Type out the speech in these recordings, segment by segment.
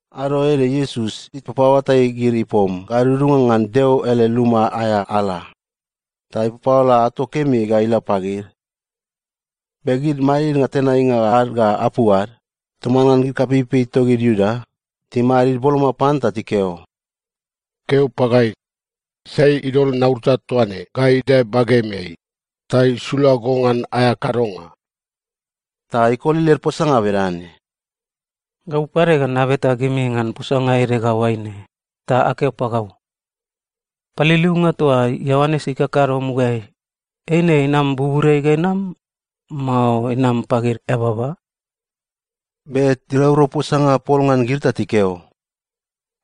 Ado ede Iesus ipapaoatai gid ipom gadudunga ngan Deo ele luma aea ala ta ipapaola ato kemi ga ila pagid. Be gid madidnga tenainga ad ga apu ad toman ngan gid kapeipei togid Iuda timadid boloma pan ta tikeo, “Keo pagai, sai idol naurata toa ne ga idae bagemeai ta isula go ngan aea kadonga?” Ta ikoli led posanga bedane, “Gau pade ga nabeta gimi ngan posanga ede ga oaine, ta akeo pagau. Paliliunga toa Ioanes ikakado mugaeai, eine inam buburiai ga inam, mao inam pagid eababa?” Be tiraurau posanga pol ngan gid ta tikeo,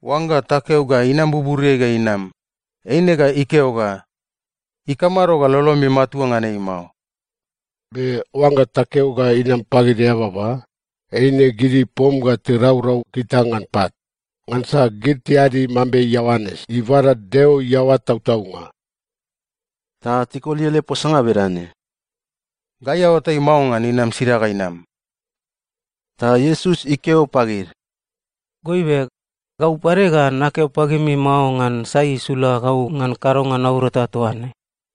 “Oangga takeo ga inam buburiai ga inam, eine ga ikeo ga, ‘Ikamado ga lolomi matua ngan ei mao?’ Be oangga takeo ga inam pagid eababa, eine gid ipom ga tiraurau gita ngan pat, ngansa gid tiadi mambe Ioanes ibada Deo iaoa tautaunga.” Ta tikoli ele posanga bedane, “Gai aoatai mao ngan inam sida ga inam.” Ta Iesus ikeo pagid, “Goibe, gau pade ga nakeo pagimi mao ngan sai isula gau ngan kadonga naurata toa ne.”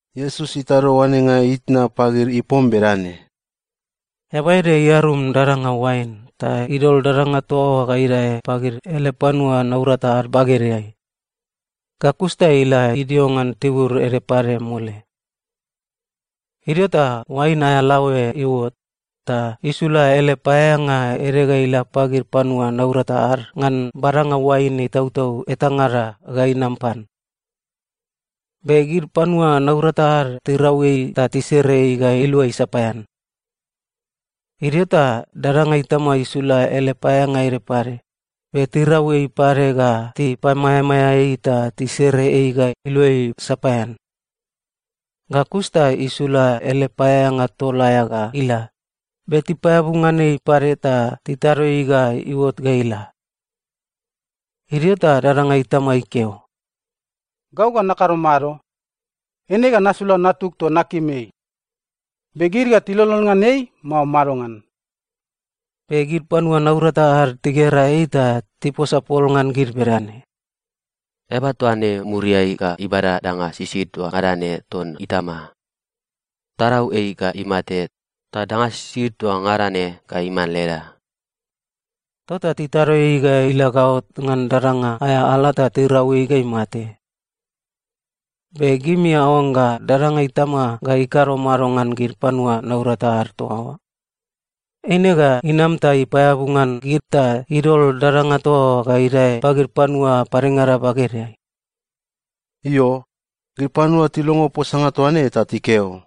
Iesus itado oanenga itna pagid ipom bedane, “Eaba ede iarum dadanga oain ta idol dadanga toa oa ga idae pagid ele panua naurata ad bagedeai. Ga kus ta ila idio ngan tibur ede pade mole. Idio ta oain aea laoe iuot, ta isula ele paeaeanga ede ga ila pagid panua naurata ad ngan badanga oain itautau etangada ga inam pan. Be gid panua naurata ad tirau ei ta tisere ei ga iluai sapaean. Idio ta dadanga itama isula ele paeaeanga ede pade, be tirau ei pade ga tipamaeamaea ei ta tisere ei ga iluai sapaean. Ga kus ta isula ele paeaeanga tol aea ga ila, be tipaeabu ngan ei pade ta titado ei ga iuot ga ila. “Idio ta dadanga itama ikeo, ‘Gau ga nakado mado? Eine ga nasula natug toa nakim ei. Be gid ga tilolon ngan ei, mao madongan?’ “Be gid panua naurata ad tigera ei ta tiposa pol ngan gid bedane, ‘Eaba toa ne muriai ga ibada danga sisid toa ngada ne ton itama. Tarau ei ga imate, ta danga sisid toa ngada ne ga iman leda!’ Tota titado ei ga ila gaot ngan dadanga aea ala ta tirau ei ga imate. “Be gimi aoangga dadanga itama ga ikado mado ngan gid panua naurata ad toa oa? Eine ga inam ta ipaeabu ngan gid ta idol dadanga toa oa ga idae pagid panua padengada bagedeai.” Io, gid panua tilongo posanga toa ne ta tikeo,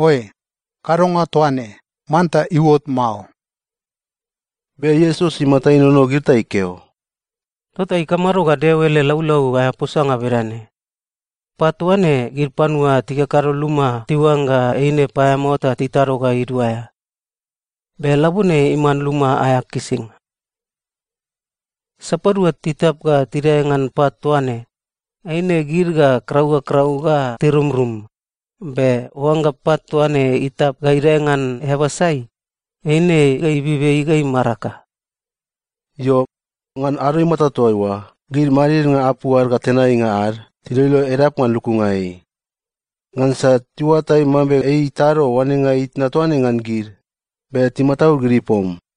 “Oe, kadonga toa ne, manta iuot mao!” Be Iesus imata inono gid ta ikeo, “Tota ikamado ga Deo ele laulau aea posanga bedane, “‘Pat toa ne, gid panua tikakado luma tiuangga eine paeamao ta titado ga iduaea. Be labone iman luma aea kisinga’? Sapadua titap ga tidae ngan pat toa ne, eine gid ga krau ga krau ga tirumrum, be oangga pat toa ne itap ga idae ngan eaba sai, eine ga ibib ei ga imaraka.” Io, ngan ado imata toa oa gid madidnga apu ad ga tenainga ad tiloilo edap ngan lukunga ei, ngansa tiuatai mambe ei itado oanenga itna toa ne ngan gid, be timataud gid ipom.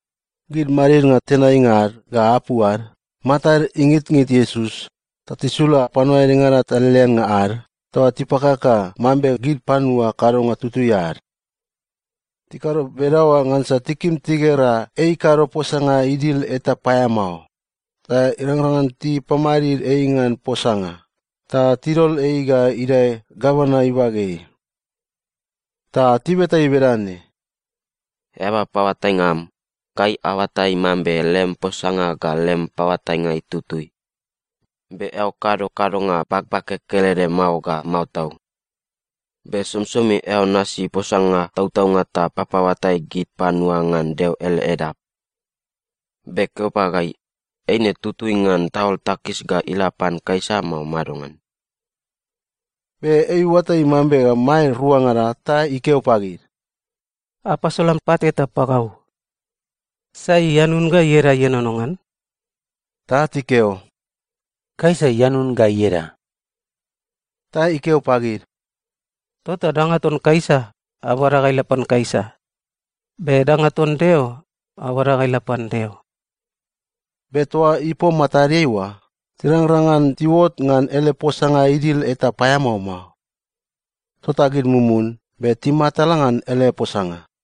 Gid madidnga tenainga ad ga apu ad matad ingitngit Iesus ta tisula panua edengada taleleannga ad toa tipakaka mambe gid panua kadonga tutui ad. Tikado bedaoa ngansa tikim tigera ei ikado posanga idil eta paeamao, ta irangrang ngan tipamadid ei ngan posanga ta tidol ei ga idae gavana ibageai. Ta tibeta ei bedane, “Eaba paoatainga am, gai aoatai mambe lem posanga ga lem paoatainga itutui, be eao kado kadonga bagbage kelede mao ga mao tau, be somisomi eao nasi posanga tautaunga ta papaoatai gid panua ngan Deo ele edap. Be keo pagai, eine tutui ngan taol takis ga ila pan Kaisa, mao madongan?” Be ei iuatai mambe maed ruangada ta ikeo pagid, “Apasolan pat eta pagau. Sai ianun ga ieda ienono ngan?” Ta tikeo, “Kaisa ianun ga ieda.” Ta ikeo pagid, “Tota danga ton Kaisa, abada ga ila pan Kaisa, be danga ton Deo, abada ga ila pan Deo.” Be toa ipom matadeai oa, tirangrang ngan tiuot ngan ele posanga idil eta paeamao mao. Tota gid mumun be timatala ngan ele posanga.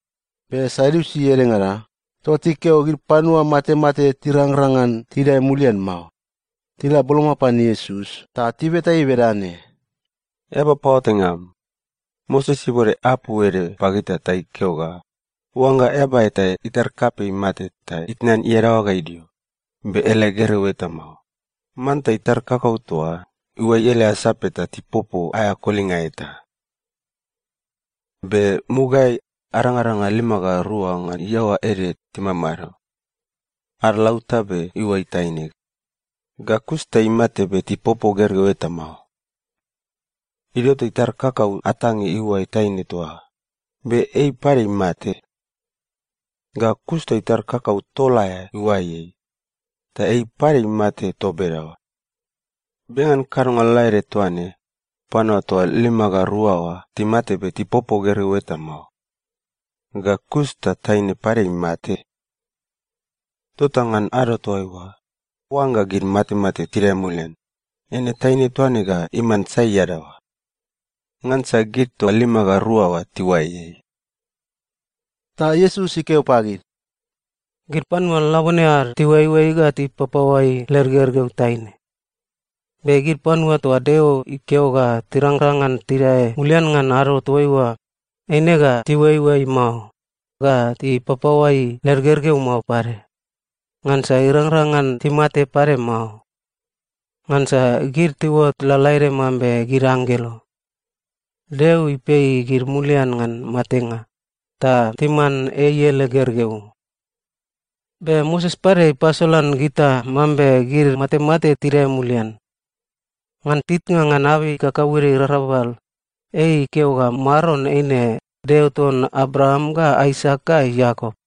Be Sadiusi edengada, toa tikeo ga gid panua matemate tirangrang ngan tidae mulian mao, tila boloma pan Iesus ta tibeta ei bedane, “Eaba paoatainga am, Moses ibode apu ede pagita ta ikeo ga oangga eaba eta itar kapei imate ta itnan iadaoa ga idio, be ele gergeu eta mao, manta itar kakau toa oa iuai ele asape ta tipopo aea kolinga eta. Be mugaeai, arangaranga lima ga rua ngan iaoa ede timamado. Ad lautabe iuai taine, ga kus ta imate be tipopo gergeu eta mao. Idio ta itar kakau atange iuai taine toa oa, be ei pade imate. Ga kus ta itar kakau tol aea iuai ei, ta ei pade imate toa bedaoa. Be ngan kadonga lalaede toa ne, panua toa lima ga rua oa timate be tipopo gergeu eta mao. Ga kus ta taine pade imate. Tota ngan ado toaiua, oangga gid matemate tidae mulian, eine taine toa ne ga iman sai iadaoa? Ngansa gid toa lima ga rua oa tiuai ei.” Ta Iesus ikeo pagid, “Gid panua labone ad tiuaioai ga tipapaoai led gergeu taine. Be gid panua toa Deo ikeo ga tirangrang ngan tidae mulian ngan ado toaiua, eine ga tiuaioai mao, ga tipapaoai led gergeu mao pade, ngansa irangrang ngan timate pade mao. Ngansa gid tiuot lalaede mambe gid anggelo. Deo ipei gid mulian ngan matenga, ta timan ei ele gergeu. Be Moses pade ipasolan gita mambe gid matemate tidae mulian. Ngan titnga ngan abei kakauede irarabal, ei ikeo ga Maron eine ‘Deo ton Abraam ga Aisak ga Iakop.’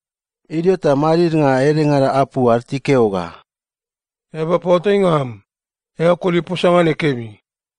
Idio ta madidnga edengada apu ad tikeo ga, “Eaba paoatainga am, eao koli posanga ne kemi.”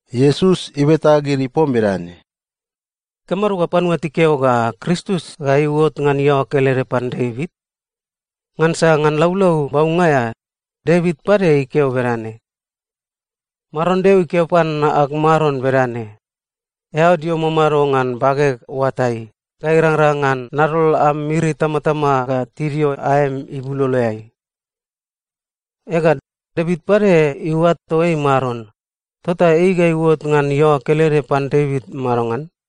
Iesus ibeta gid ipom bedane, “Ikamado ga panua tikeo ga Kristus ga iuot ngan iaoa kelede pan Devit? Ngansa ngan Laulau Baunga aea, Devit pade ikeo bedane, “‘Maron Deo ikeo pan ag Maron bedane: “Eao dio mamado ngan bageg oatai ga irangrang ngan nadol am miri itamatama ga tidio aem ibuloloeai.” ’ Ega, Devit pade iuato ei ‘Maron,’ tota ei ga iuot ngan iaoa kelede pan Devit madongan?”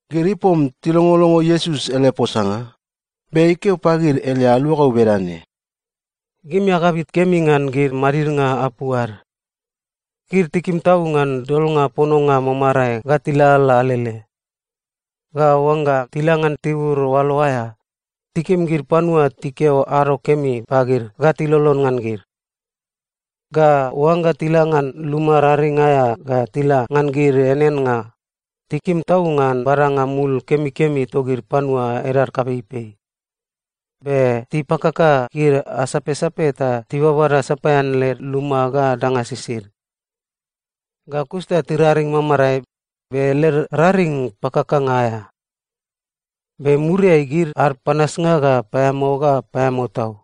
Gid ipom tilongolongo Iesus ele posanga, be ikeo pagid ele aluagau bedane, “Gimi agabit kemi ngan gid madidnga apu ad. Gid tikim tau ngan dolnga pononga mamarae ga tilalala alele. Ga oangga tila ngan tibur oalo aea, tikim gid panua tikeo ‘ado kemi’ pagid ga tilolon ngan gid. Ga oangga tila ngan luma raring aea ga tila ngan gid eaneannga, tikim tau ngan badanga mul kemikemi togid panua edad kapeipei. Be tipakaka gid asapsape ta tibabada sapaean led luma ga danga sisid. Ga kus ta tiraring mamarae, be led raring pakakanga aea. Be muriai gid ad panasnga ga paeamao ga paeamao tau.”